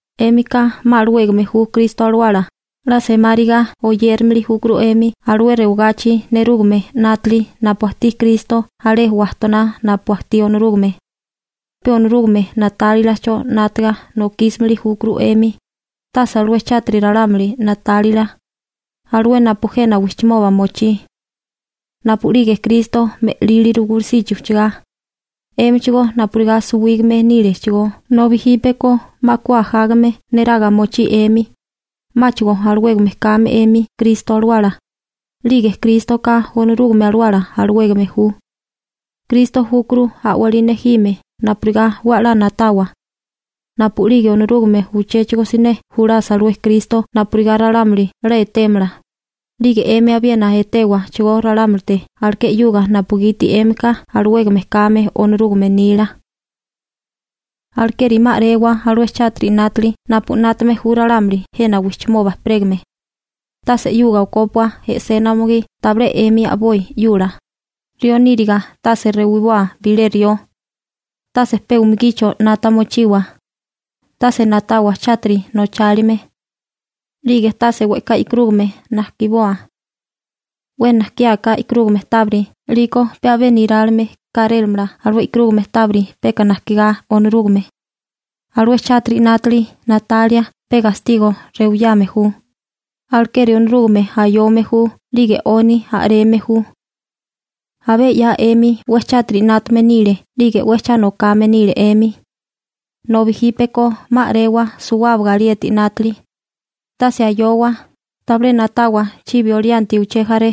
'Émika 'ma alawégame ju Kristo Alawala, 'la semáriga oyérimili júkuru 'emi alué rewagachi nerúgame 'nátili napu ajtí Kristo alé wajtoná napu ajtí Onorúgame. Pe Onorúgame na'tálilacho 'nátaga nokísimili júkuru 'emi, tase alué chátiri ralámuli na'tálila, alué napu jena wijchimoba mochí. Napu'lige Kristo me'líliru gulusichi ujchagá, 'émichigó napurigá suwígame nílechigó, nobi jípeko 'ma ku ajágame neraga mochí 'emi, 'máchigo alawégame kame 'emi Kristo Alawala, 'lige Krístoka Onorúgame Alawala alawégame ju. Kristo júkuru a'walí nejime napurigá 'we a'lá na'tawa. Napu'lige Onorúgame uchéchigo siné julasa alué Kristo napurigá ralámuli 'la etémala, 'lige 'emi abiena etéwachigó ralámulite aleké 'yuga napugiti 'émika alawégame kame Onorúgame nila. Alekeri 'ma a'rewa alué chátiri 'nátali napu 'nátame ju ralámuli jena wijchimoba ejperégame. Tase 'yuga okópua e'sena umugí tabilé 'emi a'boi 'yula. Rió níriga tase rewiboa bilé rió. Tase pe umugicho 'nata mochiwa. Tase na'tawa chátiri nochálime. 'Lige tase we'ká e'karúgame najkiboa. 'We najkiáká e'karúgame tábiri 'liko pe abé nerálime kárémala alué e'karúgame tábiri peka najkigá Onorúgame. Alué chátiri 'nátali na'talia pe gastigo rewiyame ju, alekeri Onorúgame ayome ju 'lige 'oni a'reme ju. Abé 'ya 'emi 'we chátiri 'nátame nile 'lige 'we cha nokame nile 'emi. Nobi jípeko 'ma a'rewa suwábaga alieti 'nátili. Tase ayowa, tabilé na'tawa chibi olianti uché jaré,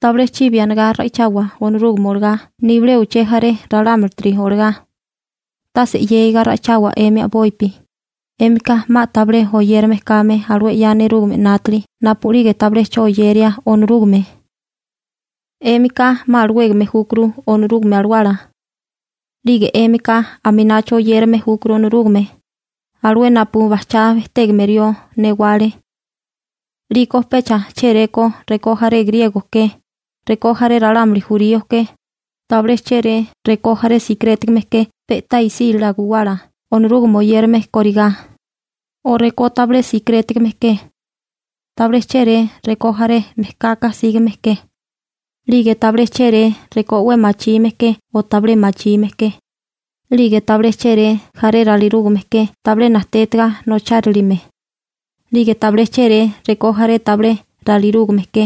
tabilé chibi anigá ra'ichawa Onorúgame olagá nibilé uché jaré ralámulitiri olagá. Tase 'yégiga ra'ichawa 'emi a'bopi, 'émika 'ma tabilé oyérame kame alué 'ya nerúgame 'nátili napu'lige tabilé 'cho oyeria Onorúgame. 'Émika 'ma alawégame júkuru Onorúgame Alawala. 'Lige 'émika aminacho oyérame júkuru Onorúgame, alué napu bajchá bejtégame rió newale. 'Liko pecha chéréko rekó jaré griego ke, rekó jaré ralámuli jurío ke. Tabilé chéré rekó jaré sikirétigame ke pe'tá isílala guwala Onorúgame oyérame kórigá, o rekó tabilé sikirétigame ke. Tabilé chéré rekó jaré mejkaka sígame ke. 'Lige tabilé chéré rekó 'we machime ke o tabilé machime ke. 'Lige tabilé chéré jaré ralirúgame ke tabilé najtétaga nochárilime, 'lige tabilé chéré rekó jaré tabilé ralirúgame ke.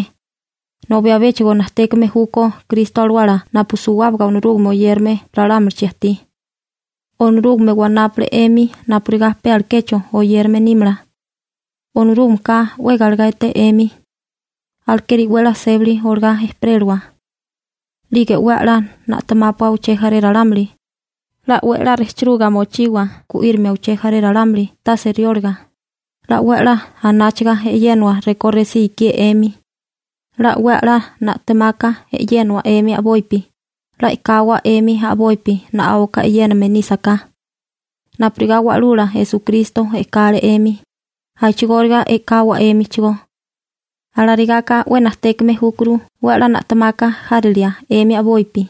Nobi abéchigo najtékame júkó Kristo Alawala napu suwábaga Onorúgame oyérame ralámulichi ajtí. Onorúgame wanápule 'emi napurigá pe alekecho oyérame nímala. Onorúgameka 'we galegá eté 'emi. Alekeri 'we 'la sébali olagá ejperélawa. 'Lige 'we 'la na'temápua uché jaré ralámuli, 'la 'we 'la rejchiruga mochiwa gu'írimia uché jaré ralámuli tase riólaga, 'la 'we 'la anáchaga e'yénawa rekó resí ikié 'emi. 'La 'we 'la na'temaka e'yénawa 'emi a'bopi, 'la e'kawa 'emi a'bopi na'áuka e'yéname nísaká. Napurigá Wa'lula Esukristo e'kale 'emi, a'chigóriga e'kawa 'émichigó. Alarigaka 'we najtékame júkuru 'we 'la na'temaka járilia 'emi a'bopi,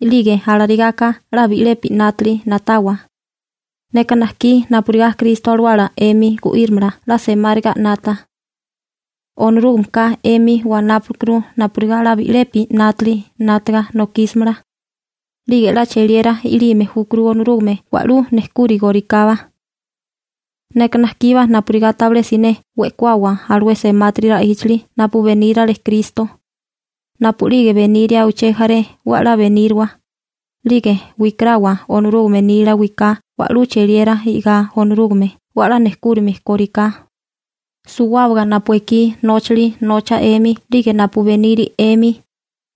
'lige alarigaka 'la bi'lepi 'nátili na'tawa. Neka najkí napurigá Kristo Alawala 'emi gu'írimala 'la semáriga 'nata. Onorúgameka 'emi wanápalekuru napurigá 'la bi'lepi 'nátali 'nátaga nokísamala. 'Lige 'la cheliera i'lime júkuru Onorúgame wa'lú nejkúrigorikábá. Neka najkíbá napurigá tabilé siné we'kuawa alué semátiri ra'íchali napu benírale Kristo. Napu'lige beniria uché jaré 'we 'la beníriwa, 'lige wikarawa Onorúgame nila wiká wa'lú cheliera i'gá Onorúgame 'we 'la nejkúrime kóriká. Suwábaga napu ekí nóchali nocha 'emi 'lige napu beniri 'emi,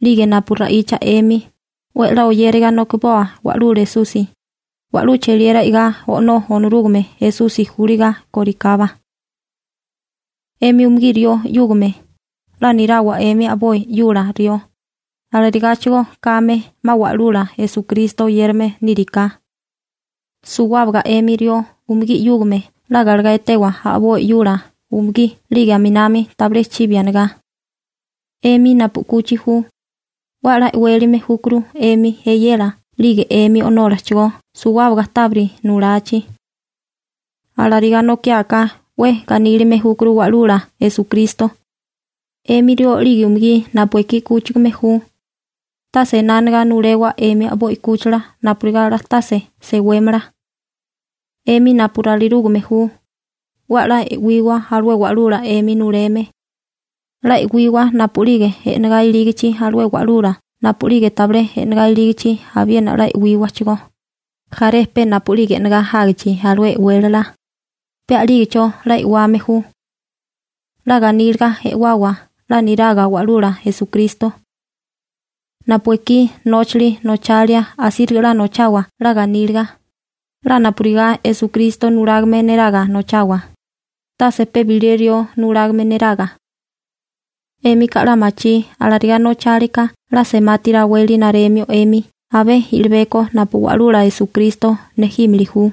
'lige napu ra'icha 'emi, 'we 'la oyériga nokiboa Wa'lula Esusi, wa'lú cheliera i'gá O'nó Onorúgame Esusi júliga kórikábá. 'Emi umugí rió 'yúgame, 'la nirawa 'emi a'boi 'yula rió, alarigáchigo kame 'ma 'la Wa'lula Esukristo oyérame níriká. Suwábaga 'emi rió umugí 'yúgame 'la galegá etewa a'boi 'yula umugí 'lige aminami tabilé chibi anigá. 'Emi napu 'kuchi ju, 'we a'lá e'wélime júkuru 'emi eyela 'lige 'emi o'nólachigó suwábaga tábiri nulachi. Alarigá nokiáká 'we ganílime júkuru Wa'lula Esukristo. 'Emi rió 'lige umugí napu ekí 'kúchigame ju, tase ená anigá nulewa 'emi a'boi 'kúchila napurigá 'la tase sewémala. 'Emi napu ralirúgame ju, 'we 'la e'wiwa alué wa'lula 'emi nuleme. 'La e'wiwa napu'lige e'negá ilígichi alué wa'lula napu'lige tabilé e'negá ilígichi abiena 'la e'wíwachigó, jaré pe napu'lige e'negá jágichi alué e'wélala, pe a'lígecho 'la e'wame ju. 'La ganíliga e'wawa 'la niraga Wa'lula Esukristo. Napu ekí nóchali nochalia asíriga 'la nochawa 'la ganíliga, 'la napurigá Esukristo nulágame neraga nochawa, tase pe bilé rió nulágame neraga. 'Émika 'la machí alarigá nochálika 'la semati raweli naremio 'emi abé i'libeko napu Wa'lula Esukristo nejímili ju.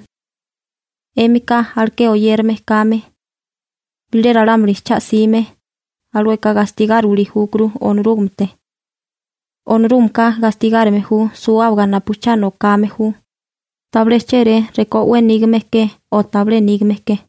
'Émika aleké oyérame kame. Bilé ralámuli cha 'sime, alueka gastigáriwili júkuru Onorúgamete. Onorúgameka gastigárime ju suwábaga napu cha nokame ju, tabilé chéré rekó 'we nígame ke o tabilé nígame ke.